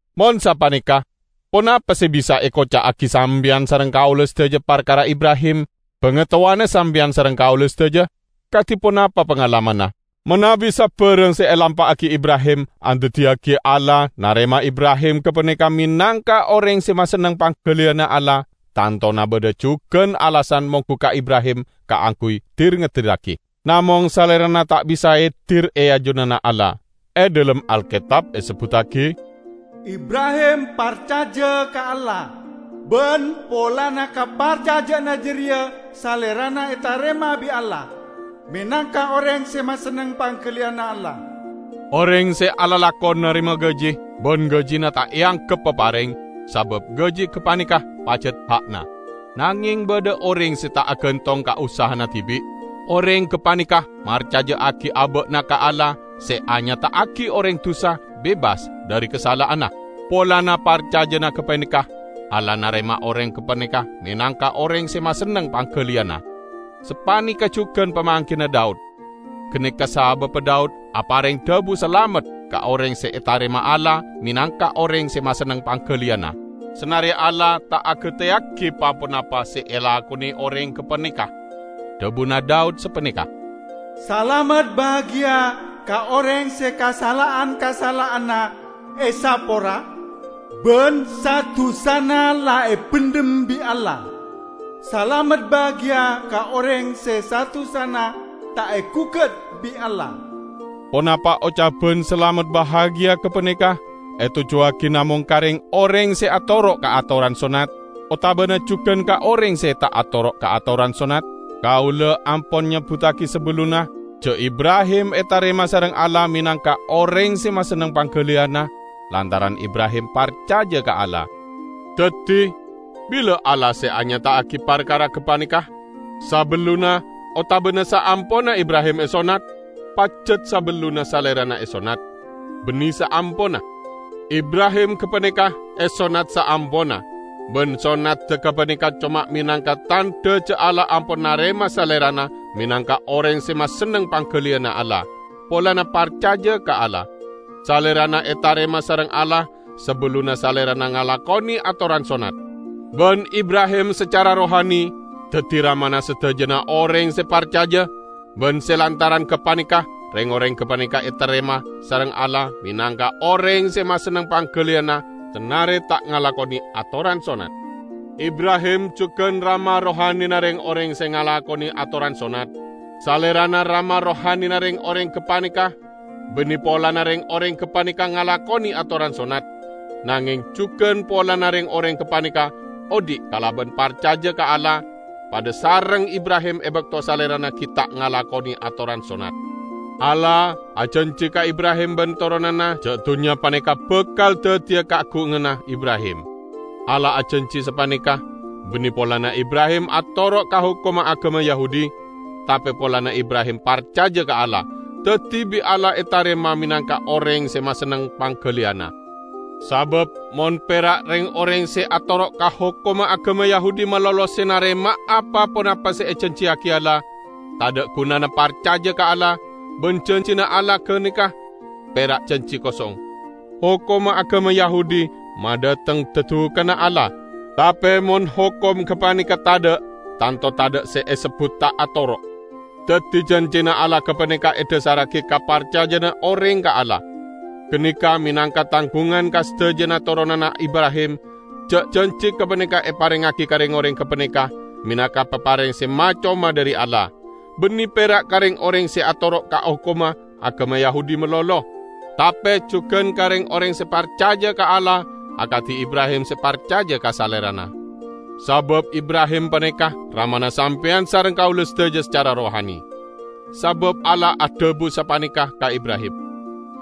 Mon sapaneka, ponapa se bisa ekoca'agi sampeyan sareng kaula sadaja parkara Ibrahim, bangatowana sampeyan sareng kaula sadaja? Kadi ponapa pangalamanna? Manabi sabarang se elampa'agi Ibrahim andaddiyagi Allah narema Ibrahim gapaneka menangka oreng se masenneng panggaliyanna Allah, tantona badha jugan alasan monggu ka Ibrahim kaangguy dir-ngedirragi. Namong salerana ta' bisa edir e ajunanna Allah. E dhalem Alketab esebbuttagi, "Ibrahim parcaja ka Allah, ban polana kaparcaja'anna jareya salerana etarema bi' Allah menangka oreng se masenneng panggaliyanna Allah." Oreng se alalakon narema gaji; ban gajina ta' eanggep papareng, sabab gaji gapaneka pajat ha'na. Nangeng badha oreng se ta' agantong ka usahana dibi'; oreng gapaneka marcaja'agi aba'na ka Allah se anyata'agi oreng dusa bebas dhari kasala'anna. Polana parcajana gapaneka Allah narema oreng gapaneka menangka oreng se masenneng panggaliyanna. Sapaneka jugan pamanggina Daud; ganeka sababba Daud apareng dhabu salamet ka oreng se etarema Allah menangka oreng se masenneng panggaliyanna, sanare Allah ta' agateyagi pa-ponapa se elakone oreng gapaneka. Dhabuna Daud sapaneka, "Salamet bahagia ka oreng se kasala'an-kasala'anna esapora ban sa-dusana la ebendhem bi' Allah! Salamet bahagia ka oreng se sa-dusana ta' egugat bi' Allah!" Ponapa ocaban salamet bahagia gapaneka etojjuwagi namong ka reng-oreng se atoro' ka atoran sonnat? Otabana jugan ka oreng se ta' atoro' ka atoran sonnat? Kaula ampon nyebbuttagi sabellunna ja' Ibrahim etarema sareng Allah menangka oreng se masenneng panggaliyanna, lantaran Ibrahim parcaja ka Allah. Daddi, bila Allah se anyata'agi parkara gapaneka? Sabellunna otabana saamponna Ibrahim esonnat? Pajat sabellunna salerana esonnat, banne saamponna. Ibrahim gapaneka esonnat saamponna, ban sonnadda gapaneka coma menangka tandha ja' Allah ampon narema salerana menangka oreng se masenneng panggaliyanna Allah, polana parcaja ka Allah. Salerana etarema sareng Allah sabellunna salerana ngalakone atoran sonnat. Ban Ibrahim sacara rohani daddi ramana sadajana oreng se parcaja ban se lantaran gapaneka reng-oreng gapaneka etarema sareng Allah menangka oreng se masenneng panggaliyanna sanare ta' ngalakone atoran sonnat. Ibrahim jugan rama rohanina reng-oreng se ngalakone atoran sonnat. Salerana rama rohanina reng-oreng gapaneka banne polana reng-oreng gapaneka ngalakone atoran sonnat, nangeng jugan polana reng-oreng gapaneka odhi' kalaban parcaja ka Allah, padha sareng Ibrahim e bakto salerana gi' ta' ngalakone atoran sonnat. Allah ajanji ka Ibrahim ban toronanna ja' dunnya paneka bakal daddiya kaagunganna Ibrahim. Allah ajanji sapaneka banne polana Ibrahim atoro' ka hokomma agama Yahudi, tape polana Ibrahim parcaja ka Allah, daddi bi' Allah etarema menangka oreng se masenneng panggaliyanna. Sabab mon pera' reng-oreng se atoro' ka hokomma agama Yahudi malolo se narema'a pa-ponapa se ejanjiyagi Allah, tadha' gunana parcaja ka Allah, ban janjina Allah ganeka pera' janji kosong. Hokomma agama Yahudi madhateng dadukanna Allah. Tape mon hokom gapaneka tadha', tanto tadha' se esebbut ta' atoro'. Daddi janjina Allah gapaneka edhasarragi ka parcajana oreng ka Allah. Ganeka menangka tanggungan ka sadajana toronanna Ibrahim ja' janji gapaneka eparengngagi ka reng-oreng gapaneka menangka papareng se ma-coma dhari Allah; banne pera' ka reng-oreng se atoro' ka hokomma agama Yahudi malolo, tape jugan ka reng-oreng se parcaja ka Allah akadi Ibrahim se parcaja ka Salerana. Sabab Ibrahim paneka ramana sampeyan sareng kaula sadaja sacara rohani. Sabab Allah adhabu sapaneka ka Ibrahim,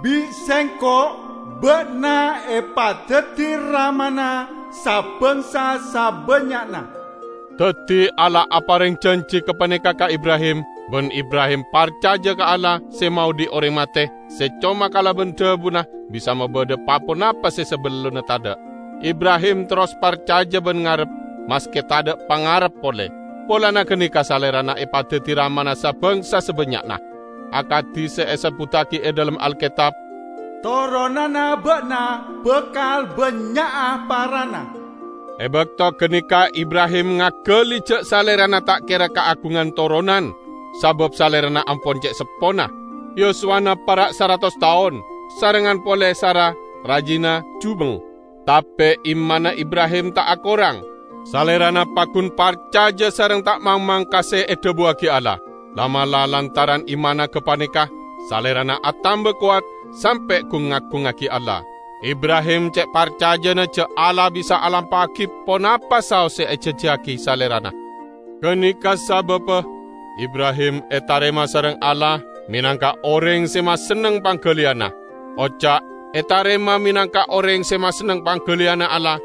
"Bi' Sengko' ba'na epadaddi ramana sa-bangsa sabannya'na." Daddi Allah apareng janji gapaneka ka Ibrahim, ban Ibrahim parcaja ka Allah, se maodhi' oreng mate, se coma kalaban dhabuna bisa mabadha pa-ponapa se sabellunna tadha'. Ibrahim terros parcaja ban ngarep, maske tadha' pangarep pole. Polana ganeka salerana epadaddi ramana sa-bangsa sabannya'na. Akadi se esebbuttagi e dhalem Alketab, "Toronanna ba'na bakal bannya'a parana." E bakto ganeka Ibrahim ngagali ja' salerana ta' kera kaagungan toronan sabab salerana ampon ce' seppona, yuswana para' saratos taon; sarengngan pole Sara, rajina, jubeng. Tape imanna Ibrahim ta' akorang. Salerana paggun parcaja sareng ta' mangmang ka se edhabuwagi Allah. La'-mala' lantaran imanna gapaneka salerana atamba kowat, sampe' gung-ngagungngagi Allah. Ibrahim ce' parcajana ja' Allah bisa alampa'agi ponapa saos se ejanjiyagi salerana. Ganeka sababba Ibrahim etarema sareng Allah menangka oreng se masenneng panggaliyanna. Oca' "etarema menangka oreng se masenneng panggaliyanna Allah"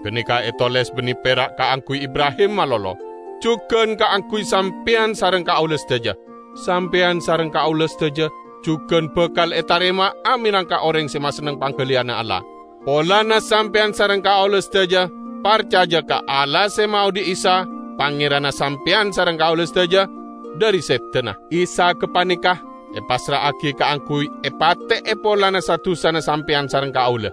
ganeka etoles banne pera' kaangguy Ibrahim malolo; jugan kaangguy sampeyan sareng kaula sadaja. Sampeyan sareng kaula sadaja jugan bakal etarema'a menangka oreng se masenneng panggaliyanna Allah, polana sampeyan sareng kaula sadaja parcaja ka Allah se maodhi' Isa, Pangeranna sampeyan sareng kaula sadaja, dhari sedana. Isa gapaneka epassra'agi kaangguy epate'e polana sa-dusana sampeyan sareng kaula.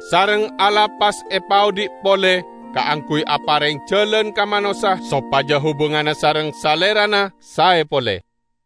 Sareng Allah pas epaodhi' pole kaangguy apareng jalan ka manossa sopaja hubunganna sareng Salerana sae pole.